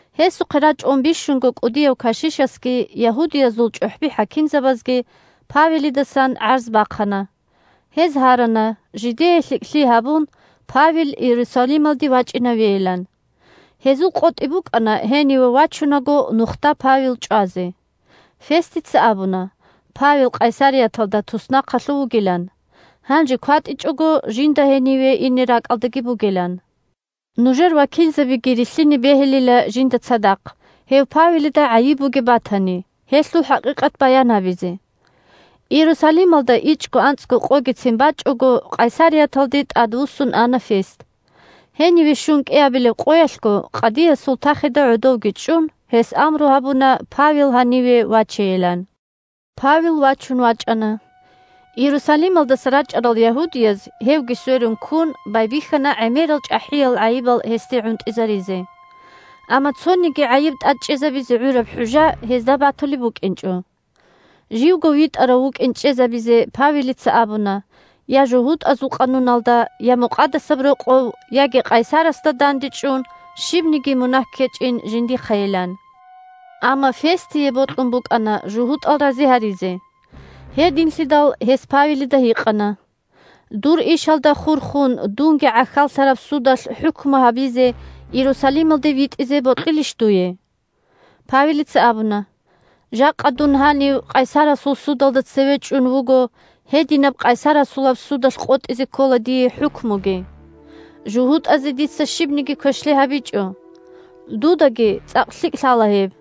Гьесухъе рачӀун бищунго кӀудияв кашишасги ягьудиязул чӀухӀби-хӀакимзабазги Павелидасан гӀарз бахъана. Гьез гьарана, жидее лъикӀлъи гьабун, Павел Иерусалималде вачӀинавейилан. Гьезул къотӀи букӀана гьениве вачунаго нухда Павел чӀвазе. Фестица абуна Павел Къайсарияталда туснахъалъув вугилан, гьанже кватӀичӀого жинда гьениве ине ракӀалдаги бугилан. Нужер вакилзабиги рилълъине бегьилила жинда цадахъ, гьев Павелида гӀайиб бугеб батани, гьелъул хӀакъикъат баян гьабизе. Иерусалималда ичӀго-анцӀго къогицин бачӀого, Къайсарияталде тӀадвуссун ана Фест. Гьениве щун кӀиабилеб къоялъго, къадиясул тахида гӀодовги чӀун, гьес амру гьабуна Павел гьаниве вачейилан. Павел вачун вачӀана. Иерусалималдаса рачӀарал ягьудияз, гьевги сверун ккун, байбихьана гӀемерал чӀахӀиял гӀайибал гьесде гӀунтӀизаризе. Амма цониги гӀайиб тӀад чӀезабизе гӀураб хӀужжа гьезда батулеб букӀинчӀо. Живго витӀарав вукӀин чӀезабизе Павелица абуна я жугьутӀазул къануналда, я Мукъадасаб Рокъов, яги къайсарасда дандечӀун щибниги мунагь ккечӀин жиндихъайилан. Амма Фестие бокьун букӀана жугьутӀал рази гьаризе. Гьединлъидал гьес Павелида гьикъана: – Дур ишалда хурхун дунги гӀахьаллъараб судалъ хӀукму гьабизе Иерусалималде витӀизе бокьилищ дуе? Павелица абуна: – Жакъа дун гьанив къайсарасул судалда цеве чӀун вуго, гьединаб къайсарасулаб судалъ къотӀизе ккола дие хӀукмуги. ЖугьутӀазе дица щибниги квешлъи гьабичӀо. Дудаги цӀакъ лъикӀ лъала гьеб.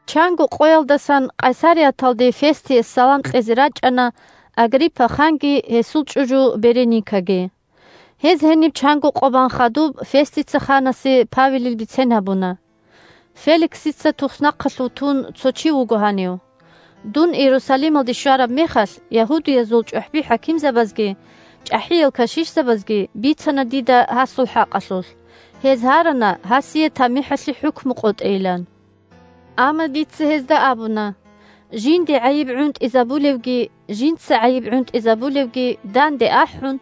Чанго къоялдасан Къайсарияталде Фестие салам кьезе рачӀана Агриппа ханги гьесул чӀужу Береникаги. Гьез гьениб чанго къо бан хадуб, Фестица ханасе Павелил бицен гьабуна: – Феликсица туснахъалъув тун цо чи вуго гьанив. Дун Иерусалималде щвараб мехалъ, ягьудиязул чӀухӀби-хӀакимзабазги чӀахӀиял кашишзабазги бицана дида гьасул хӀакъалъулъ, гьез гьарана гьасие тамихӀалъе хӀукму къотӀейилан. Амма дица гьезда абуна, жинде гӀайиб гӀунтӀизабулевги жинца гӀайиб гӀунтӀизабулевги данде ахӀун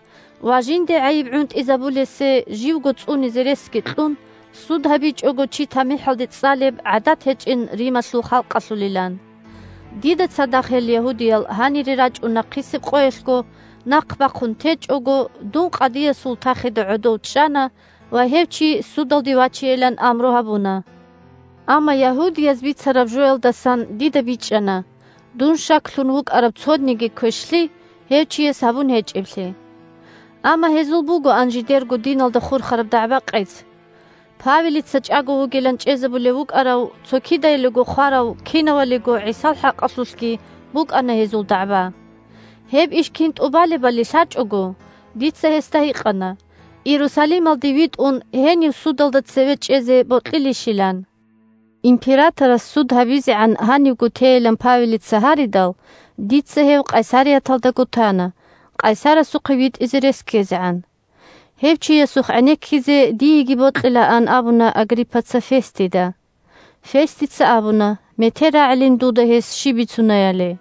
ва жинде гӀайиб гӀунтӀизабулесе живго цӀунизе ресги кьун, суд гьабичӀого чи тамихӀалде цӀалеб гӀадат гьечӀин Рималъул халкъалъулилан. Дида цадахъ гьел ягьудиял гьанире рачӀун нахъисеб къоялъго, нахъ бахъун течӀого, дун къадиясул тахида гӀодов чӀана ва гьев чи судалде вачейилан амру гьабуна. Амма ягьудияз бицараб жоялдасан дида бичӀчӀана – дун щаклъун вукӀараб цониги квешлъи гьев чияс гьабун гьечӀеблъи. Амма гьезул бугоан жидерго диналда хурхараб дагӀба-къец. Павелица чӀаго вугилан чӀезабулеб букӀарав, цо кидаялиго хварав кинавалиго ГӀисал хӀакъалъулъги букӀана гьезул дагӀба. Гьеб иш кин тӀубалебали лъачӀого, дица гьесда гьикъана, Иерусалималде витӀун, гьенив судалда цеве чӀезе бокьилищилан. Императорас суд гьабизегӀан гьанивго тейилан Павелица гьаридал, дица гьев Къайсарияталдаго тана, къайсарасухъе витӀизе рес ккезегӀан. Гьев чиясухъ гӀенеккизе диеги бокьилаанилан абуна Агриппаца Фестида. Фестица абуна метер рагӀилин дуда гьес щиб бицунаяли.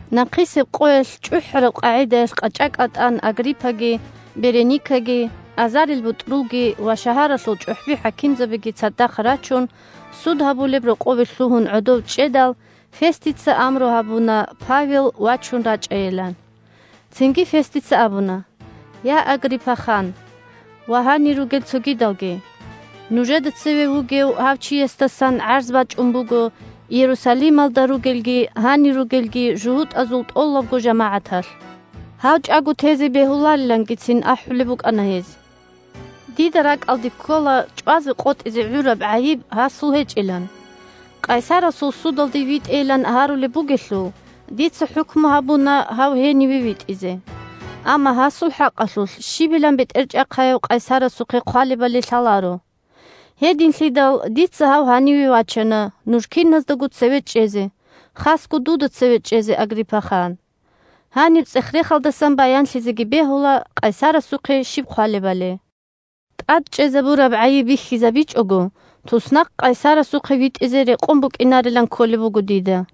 Нахъисеб къоялъ чӀухӀараб къагӀидаялъ къачӀа-кӀатӀан Агриппаги, Береникаги, азарилбутӀрулги ва шагьаралъул чӀухӀби-хӀакимзабиги цадахъ рачун, суд гьабулеб рокъове лъугьун гӀодов чӀедал, Фестица амру гьабуна Павел вачун рачӀайилан. Цинги Фестица абуна: – Я, Агриппа хан ва гьанир ругел цогидалги! Нужеда цеве вугев гьав чиясдасан гӀарз бачӀун буго Иерусалималда ругелги гьанир ругелги жугьутӀазул тӀолабго жамагӀаталъ. Гьав чӀаго тезе бегьуларилангицин ахӀулеб букӀана гьез. Дида ракӀалде ккола чӀвазе къотӀизе гӀураб гӀайиб гьасул гьечӀилан. Къайсарасул судалде витӀейилан гьарулеб бугелъул, дица хӀукму гьабуна гьав гьениве витӀизе. Амма гьасул хӀакъалъулъ щибилан бетӀерчӀахъаяв къайсарасухъе хъвалебали лъаларо. Гьединлъидал дица гьав гьаниве вачана нуж киназдаго цеве чӀезе, хасго дуда цеве чӀезе, Агриппа хан. Гьаниб цӀех-рехалдасан баянлъизеги бегьула къайсарасухъе щиб хъвалебали. ТӀад чӀезабураб гӀайиб бихьизабичӀого, туснахъ къайсарасухъе витӀизе рекъон букӀинарилан кколеб буго дида.